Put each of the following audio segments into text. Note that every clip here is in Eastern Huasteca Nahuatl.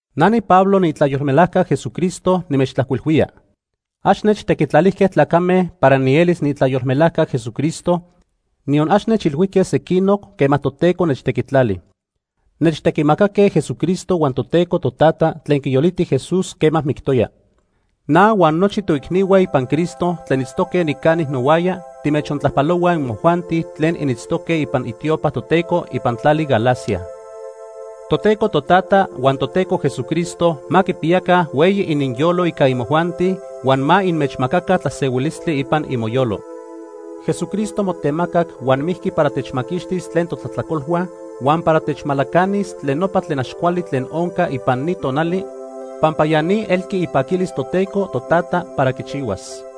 Na niPablo, niitlayolmelajca Jesucristo nimechtlajcuilhuía. Ax nechtequitlalijque tlacame para nielis niitlayolmelajca Jesucristo, niyon ax nechilhuijque sequinoc quema Toteco nechtequitlali. Nechtequimacaque Jesucristo huan Toteco Totata tlen quiyoliti Jesús quema mictoya. Na huan nochi toicnihua ipan Cristo tlen itztoque nicani nohuaya timechtlajpalohuaj imojuanti tlen initztoque ipan itiopahua Toteco ipan tlali Galacia. Toteco Totata huan Toteco Jesucristo ma quipiyaca hueyi ininyolo ica imojuanti huan ma inmechmacaca tlasehuilistli ipan imoyolo. Jesucristo motemacac huan mijqui para techmaquixtis tlen totlajtlacolhua huan para techmalacanis tlen nopa tlen ax cuali tlen onca ipan ni tonali pampa ya ni elqui ipaquilis Toteco Totata para quichihuas.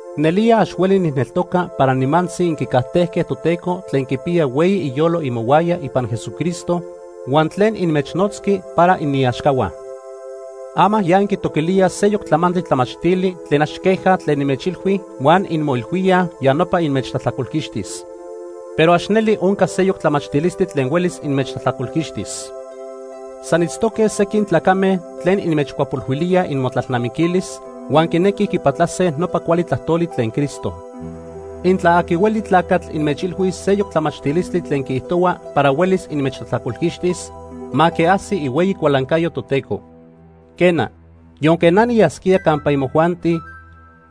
Nelía ax hueli nijneltoca para nimantzi inquicajtejque Toteco tlen quipiya hueyi iyolo imohuaya ipan Jesucristo huan tlen inmechnotzqui para iniaxcahua. Ama ya inquitoquilíaj seyoc tlamantli tlamachtili tlen ax queja tlen nimechilhui huan inmoilhuíaj ya nopa inmechtlajtlacolquixtis. Pero ax neli onca seyoc tlamachtilistli tlen huelis inmechtlajtlacolquixtis. San itztoque sequin tlacame tlen inmechcuapolhuilíaj imotlalnamiquilis, huan quinequij quipatlase nopa cuali tlajtoli tlen Cristo. Intla aqui hueli tlacatl inmechilhuis seyoc tlamachtilistli tlen quiijtohua para huelis inmechtlajtlacolquixtis, ma quiajsi ihueyi cualancayo Toteco. Quena, yonque na niyasquía campa imojuanti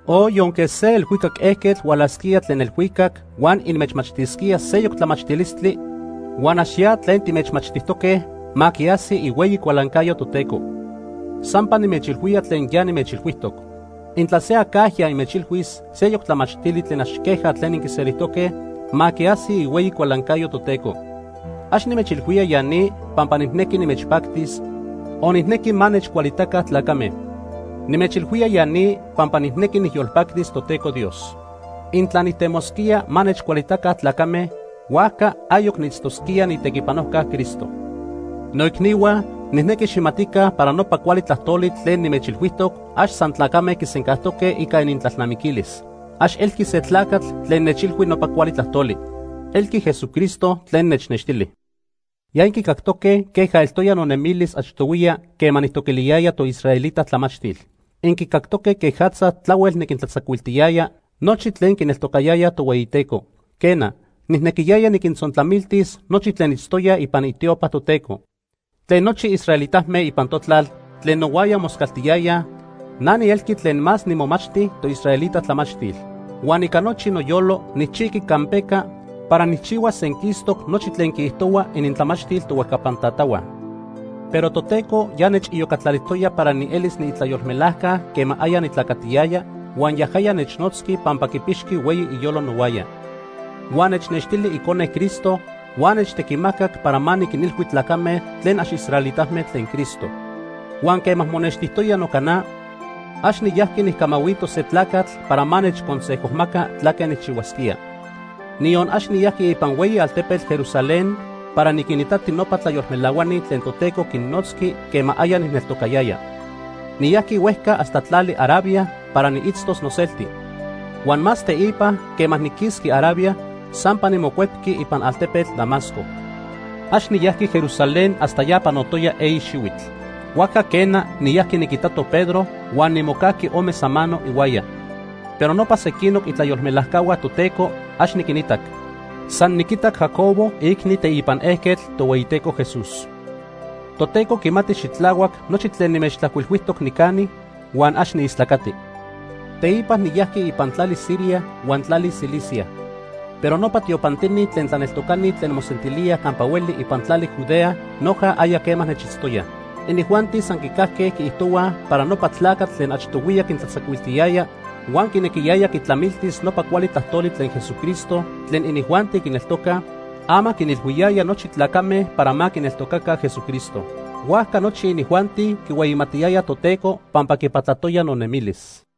o yonque se elhuicac ejquetl hualajsquía tlen elhuicac huan inmechmachtisquía seyoc tlamachtilistli huan ax ya tlen timechmachtijtoque, ma quiajsi ihueyi cualancayo Toteco. Sampa nimechilhuía tlen ya nimechilhuijtoc. Intla se acajya inmechilhuis seyoc tlamachtili tlen ax queja tlen inquiselijtoque, ma quiajsi ihueyi cualancayo Toteco. Ax nimechilhuía ya ni pampa nijnequi nimechpactis, o nijnequi ma nechcualitaca tlacame. Nimechilhuía ya ni pampa nijnequi nijyolpactis Toteco Dios. Intla nijtemosquía ma nechcualitaca tlacame, huajca ayoc niitztosquía niitequipanojca Cristo. Noicnihua, nijnequi xijmatica para nopa cuali tlajtoli tlen nimechilhuijtoc ax san tlacame quisencajtoque ica inintlalnamiquilis. Ax elqui se tlacatl tlen nechilhui nopa cuali tlajtoli. Elqui Jesucristo tlen nechnextili. Ya inquicactoque queja eltoya nonemilis achtohuiya quema nijtoquiliyaya toisraelita tlamachtil. Inquicactoque quejatza tlahuel niquintlatzacuiltiyaya nochi tlen quineltocayayaj Tohueyiteco. Quena, nijnequiyaya niquintzontlamiltis nochi tlen itztoyaj ipan itiopa Toteco. Tlen nochi israelitame ipan notlal tlen nohuaya moscaltiyayaj na nielqui tlen más nimomachti toisraelita tlamachtil. Huan ica nochi noyolo nijchijqui campeca para nijchihuas senquistoc nochi tlen quiijtohua inintlamachtil tohuejcapan tatahua. Pero Toteco ya nechiyocatlalijtoya para nielis niitlayolmelajca quema aya nitlacatiyaya, huan yajaya nechnotzqui pampa quipixqui hueyi iyolo nohuaya. Huan nechnextili Icone Cristo huan nechtequimacac para ma niquinilhui tlacame tlen ax israelitame tlen Cristo. Huan quema monextijtoya noca na, ax niyajqui nijcamahuito se tlacatl para ma nechconsejomaca tlaque nijchihuasquía. Niyon ax niyajqui ipan hueyi altepetl Jerusalén para niquinitati nopa tlayolmelahuani tlen Toteco quinnotzqui quema aya nijneltocayaya. Niyajqui huejca hasta tlali Arabia para niitztos noselti. Huan más teipa quema niquisqui Arabia, sampa nimocuepqui ipan altepetl Damasco. Ax niyajqui Jerusalén hasta ya panotoya eyi xihuitl. Huajca quena, niyajqui niquitato Pedro huan nimocajqui ome samano ihuaya. Pero nopa sequinoc itlayolmelajcahua Toteco, ax niquinitac. San niquitac Jacobo, iicni teipan ejquetl Tohueyiteco Jesús. Toteco quimati xitlahuac nochi tlen nimechtlajcuilhuijtoc nicani huan ax niistlacati. Teipa niyajqui ipan tlali Siria huan tlali Cilicia. Pero nopa tiopantini tlen tlaneltocani tlen mosentilíaj campa hueli ipan tlali Judea noja aya quema nechitztoyaj. Inijuanti san quicajque quiijtohuaj para nopa tlacatl tlen achtohuiya quintlatzacuiltiyaya huan quinequiyaya quitlamiltis nopa cuali tlajtoli tlen Jesucristo tlen inijuanti quineltocaj, ama quinilhuiyaya nochi tlacame para ma quineltocaca Jesucristo. Huajca nochi inijuanti quihueyimatiyayaj Toteco pampa quipatlatoya nonemilis.